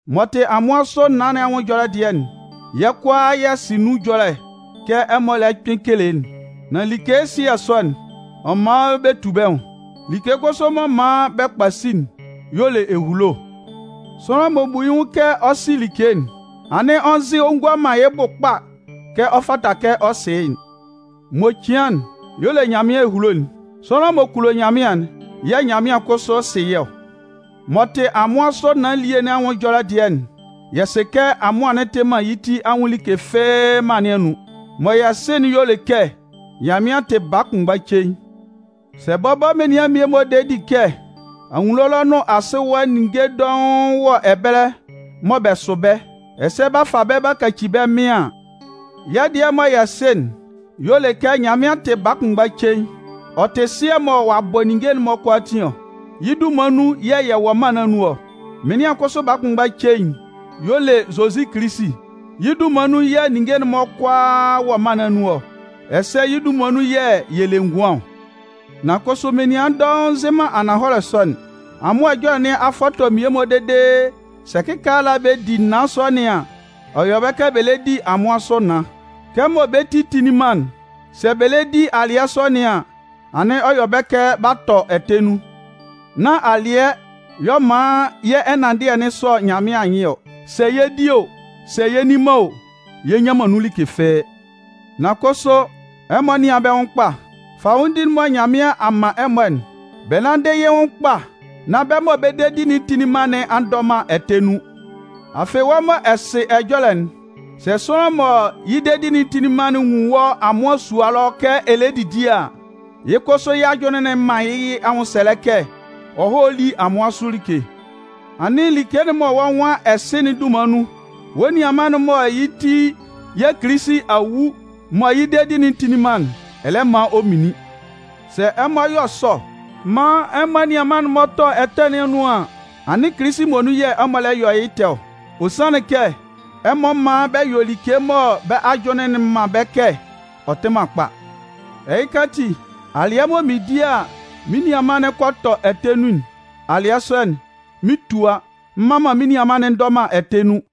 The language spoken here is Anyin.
M'ɔ tɩ amʋan sʋ naan nɩn anwʋn ɛjɔlɛ dɩɛ'n, yɛ́ kʋalaa yɛ sɩ nun ɛjɔlɛ kɛ ɛmɔ lɛ kpɩn kele'n. Nan like ɛsɩɛ sɔ'n, ɔ man bɛ tu bɛ́ nwʋn. Like kʋsʋ m'ɔ man bɛ kpasi'n y'ɔ le ehulo'n. Sʋanlan m'ɔ bu yɩ́ nwʋn kɛ ɔ sɩ like'n, anɩn ɔ nzɩ ɔ ngua man yɩ́ bʋ kpa kɛ ɔ fata kɛ ɔ sɩ́ yɩ́'n. (M'ɔ cian'n y'ɔ le Nyanmɩan ehulo'n.) Sʋanlan m'ɔ kulo Nyanmɩan'n yɛ̂ Nyanmɩan kʋsʋ sɩ yɩ́ ɔ. M'ɔ tɩ amʋan sʋ naan elie nɩn anwʋn ɛjɔlɛ dɩɛ'n, yɛ sɩ kɛ amʋan'n tɩ man yɩ́ ti anwʋn like fɩ́ɩ́ mân nɩn anun. Mɔ yɛ sɩ'n y'ɔ le kɛ Nyanmɩan tɩ baa kʋnmgba cein. Sɛ bɔbɔ menian mmie-mɔ de di kɛ anwunno ɛlɔ nʋn asɩ ɛwa, ninnge dɔʋn wɔ ɛbɛlɛ mɔ bɛ sʋ bɛ́, ɛsɛ b'a fa bɛ́ b'a kaci bɛ́ mɩn an, yɛ́ dɩɛ mɔ yɛ sɩ'n y'ɔ le kɛ Nyanmɩan tɩ baa kʋnmgba cein. Ɔ tɩ Sɩɛ mɔ ɔ'a bɔ ninnge'n-mɔ kʋalaatin ɔ. Yɩ́ dunman nun yɛ̂ yɛ wɔ mân nɩn anun ɔ. Mɩnlɩan kʋsʋ baa kʋnmgba cein'n y'ɔ le Zozi Kilisi. Yɩ́ dunman nun yɛ̂ ninnge'n-mɔ kʋalaa wɔ mân nɩn anun ɔ, ɛsɛ yɩ́ dunman nun yɛ̂ yɛ le ngʋan ɔ. Nan kʋsʋ menian dɔʋn nzɩ man ananhɔlɛ sɔ'n. Amʋan ɛjɔlɛ nɩn a fɔtɔ mmie-mɔ dede sɛ kɩkaala bɛ di naan sɔ nɩn an, ɔ yɔ bɛ kɛ bɛ lɛ di amʋan sʋ naan. Kɛmɔ bɛ́ ti tinlin man'n, sɛ bɛ lɛ di alɩɛ sɔ nɩn an, anɩn ɔ yɔ bɛ kɛ b'a tɔ ɛtɛ nun. Nán alɩɛ y'ɔ man yɛ́ ɛnanndɩɛ'n sɔ Nyanmɩan anyɩn ɔ. Sɛ yɛ di o, sɛ y'a nni man o, yɛ nnyan man nun like fɩ́ɩ́. Nan kʋsʋ, ɛmɔ nɩ́an bɛ́ nwʋn kpa. Fanwʋndi'n mɔ Nyanmɩan a man ɛmɔ'n, bɛ nánndɩ yɩ́ nwʋn kpa nán bɛ́ mɔ bɛ dedi'n tinlin man nɩn a ndɔ man ɛtɛ nun. Afɩ, wɔ́ mɔ ɛ sɩ ɛjɔlɛ'n, sɛ sʋanlan mɔ yɩ́ dedi'n tinlin man'n nwun wɔ́ amʋan sua ɛlɔ kɛ ɛ lɛ didi a, yɩ́ kʋsʋ yɩ́ ajʋnlɩn'n 'man yɩ́ anwʋnsɛlɛ kɛ ɔ hɔ́ lí amʋan sʋ like. Anɩn like'n mɔ wɔ́ nwan ɛ sɩ'n dunman nun, wɔ́ nianman'n mɔ yɩ́ ti yɛ̂ Kilisi a wu mɔ yɩ́ dedi'n tinlin man'n, ɛ lɛ man ɔ minlin. Sɛ ɛmɔ yɔ sɔ maan ɛmɔ anianman'n-mɔ tɔ ɛtɛ nɩn anun an, anɩn Kilisi muonun yɛ̂ ɛmɔ lɛ yɔ yɩ́ ɛtɛ ɔ. Ɔ sanlɩn kɛ, ɛmɔ man bɛ yɔ like mɔ bɛ́ ajʋnlɩn'n man bɛ́ kɛ ɔ tɩ man kpa. Ɛhɩka ati, alɩɛ mɔ mɩn di a mɩ́n nianman'n kɔ tɔ ɛtɛ nun'n, alɩɛ sɔ'n, mɩn 'tua, m mman man mɩ́n nianman'n ndɔ man ɛtɛ nun.